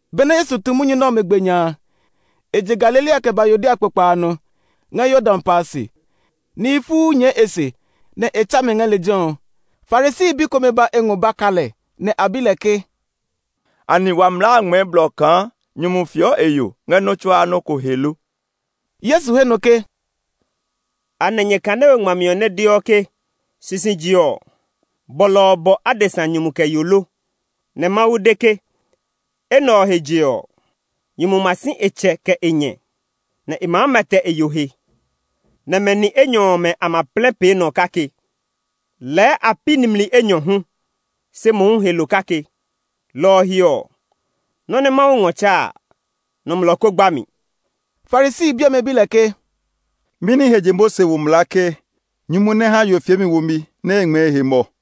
Benɛ Yesu tu munyu nɛ ɔmɛ gbe nya a, e je Galilea kɛ ba Yudea kpokpa a nɔ, ngɛ Yordan pa a se. Nihi fuu nyɛɛ e se, nɛ e tsa mɛ ngɛ lejɛ ɔ. Farisi bi komɛ ba e ngɔ ba ka lɛ, nɛ a bi lɛ ke, “Anɛ wa mlaa a ngmɛɛ blɔ kaa nyumu fieɔ e yo ngɛ nɔ́ tsuaa nɔ́ ko he lo?” Yesu he nɔ ke, “Anɛ nyɛ kane we ngmami ɔ nɛ deɔ ke sisije ɔ, bɔlɔ ɔ bɔ adesa nyumu kɛ yo lo? Nɛ Mawu de ke, ‘Enɛ ɔ he je ɔ, nyumu ma si e tsɛ kɛ e nyɛ, nɛ e maa mɛtɛ e yo he, nɛ mɛ ni enyɔ ɔmɛ a ma plɛ pee nɔ kake.’ Lɛɛ a pi nimli enyɔ hu, se mohu he lo kake. Lɔ ɔ he ɔ, nɔ́ nɛ Mawu ngɔ tsa a, nɔmlɔ kó gba mi.” Farisi bi ɔmɛ bi lɛ ke, “Mɛni he je Mose wo mlaa ke nyumu nɛ ha yo fiemi womi nɛ e ngmɛɛ e he mɔ?”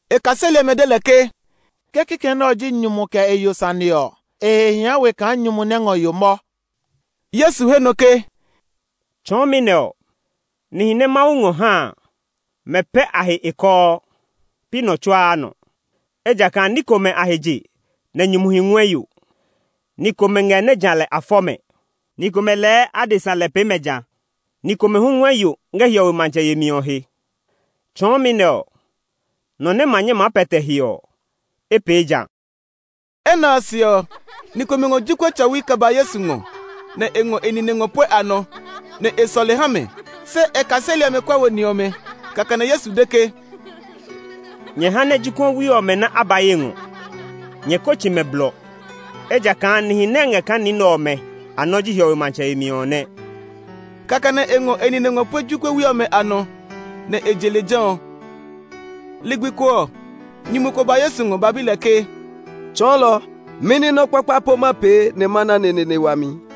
E kaseli ɔmɛ de lɛ ke, “Ke kikɛ nɛ ɔ ji nyumu kɛ e yo sane ɔ, e he hia we kaa nyumu nɛ ngɔ yo mɔ.” Yesu he nɔ ke, “Tsɔɔmi nɛ ɔ, nihi nɛ Mawu ngɔ ha a, mɛ pɛ a he e kɔɔ; pi nɔ tsuaa nɔ. Ejakaa ní komɛ a he je nɛ nyumuhi ngɔɛ yo; ni komɛ ngɛ nɛ ja lɛ a fɔ mɛ; ni komɛ lɛɛ adesa lɛ pee mɛ ja; ni komɛ hu ngɔɛ yo ngɛ hiɔwe matsɛ yemi ɔ he. Tsɔɔmi nɛ ɔ, nɔ nɛ ma nyɛ maa pɛtɛ he ɔ, e pee ja.” Enɛ ɔ se ɔ, ni komɛ ngɔ jokuɛ tsɔwi kɛ ba Yesu ngɔ nɛ e ngɔ e nine ngɔ pue a nɔ, nɛ e sɔle ha mɛ. Se e kaseli ɔmɛ kuɛ wo ni ɔmɛ. Kɛkɛ nɛ Yesu de ke, “Nyɛ ha nɛ jokuɛwi ɔmɛ nɛ a ba ye ngɔ; nyɛ ko tsi mɛ blɔ, ejakaa nihi nɛ ngɛ kaa ni nɛ ɔmɛ a nɔ ji hiɔwe matsɛ yemi ɔ nɛ.” Kɛkɛ nɛ e ngɔ e nine ngɔ pue jokuɛwi ɔmɛ a nɔ, nɛ e je lejɛ ɔ. Ligbi ko ɔ, nyumu ko ba Yesu ngɔ ba bi lɛ ke, “Tsɔɔlɔ, mɛni nɔ́ kpakpa po ma pee nɛ ma na neneene wami?”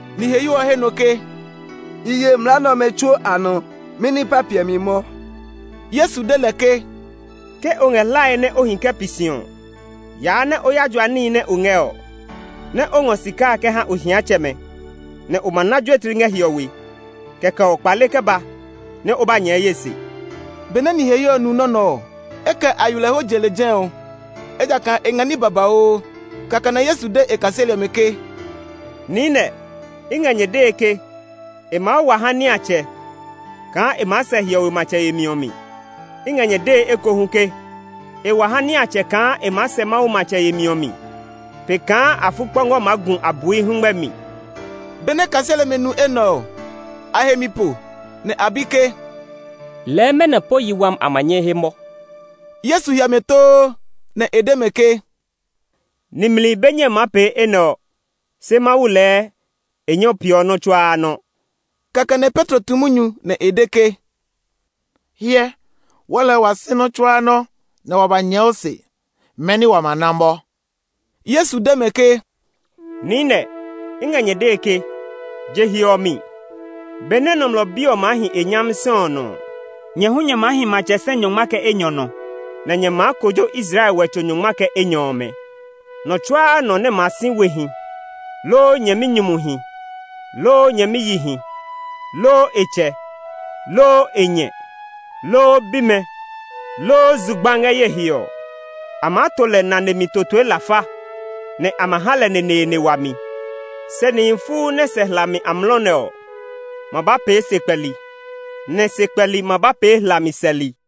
Niheyo ɔ he nɔ ke, “I ye mlaa nɛ ɔmɛ tsuo a nɔ; mɛni pa piɛ mi mɔ?” Yesu de lɛ ke, “Ke o ngɛ hlae nɛ o hi kɛ pi si ɔ, yaa nɛ o ya jua níhi nɛ o ngɛ ɔ, nɛ o ngɔ sika a kɛ ha ohiatsɛmɛ, nɛ o ma na juetli ngɛ hiɔwe. Kɛkɛ ɔ, kpale kɛ ba nɛ o ba nyɛɛ ye se.” Benɛ niheyo ɔ nu nɔ́ nɛ ɔ, e kɛ aywilɛho je lejɛ ɔ; ejakaa e ngɛ ní babauu. Kɛkɛ nɛ Yesu de e kaseli ɔmɛ ke, “Niinɛ, i ngɛ nyɛ dee ke, e maa wa ha niatsɛ kaa e maa sɛ hiɔwe matsɛ yemi ɔ mi. I ngɛ nyɛ dee ekohu ke e wa ha niatsɛ kaa e maa sɛ Mawu matsɛ yemi ɔ mi pe kaa afukpɔngɔ maa gu abui hɛngmɛ mi.” Benɛ kaseli ɔmɛ nu enɛ ɔ, a he mi po, nɛ a bi ke, “Lɛɛ mɛnɔ po yi wami a ma nyɛ he mɔ?” Yesu hyɛ mɛ too, nɛ e de mɛ ke, “Nimli be nyɛe maa pee enɛ ɔ; se Mawu lɛɛ e nyɛɔ peeɔ nɔ́ tsuaa nɔ!” Kɛkɛ nɛ Petro tu munyu nɛ e de ke, “Hyɛ, wɔɔ lɛɛ wa si nɔ́ tsuaa nɔ́, nɛ wa ba nyɛɛ o se. Mɛni wa ma na mɔ?” Yesu de mɛ ke, “Niinɛ, i ngɛ nyɛ dee ke, je he ɔ mi, benɛ Nɔmlɔ Bi ɔ maa hi e nyami sɛ ɔ nɔ ɔ, nyɛ hu nyɛ maa hi matsɛ sɛ nyɔngma kɛ enyɔ nɔ, nɛ nyɛ maa kojo Israel wɛtso nyɔngma kɛ enyɔ ɔmɛ. Nɔ tsuaa nɔ nɛ ma si wehi, loo nyɛminyumuhi, loo nyɛmiyihi, loo e tsɛ, loo e nyɛ, loo bimɛ, loo zugba ngɛ ye he ɔ, a maa to lɛ nane mi totoe lafa, nɛ a ma ha lɛ neneene wami. Se nihi fuu nɛ sɛ hlami amlɔ nɛ ɔ ma ba pee sekpɛli, nɛ sekpɛli ma ba pee hlami sɛli.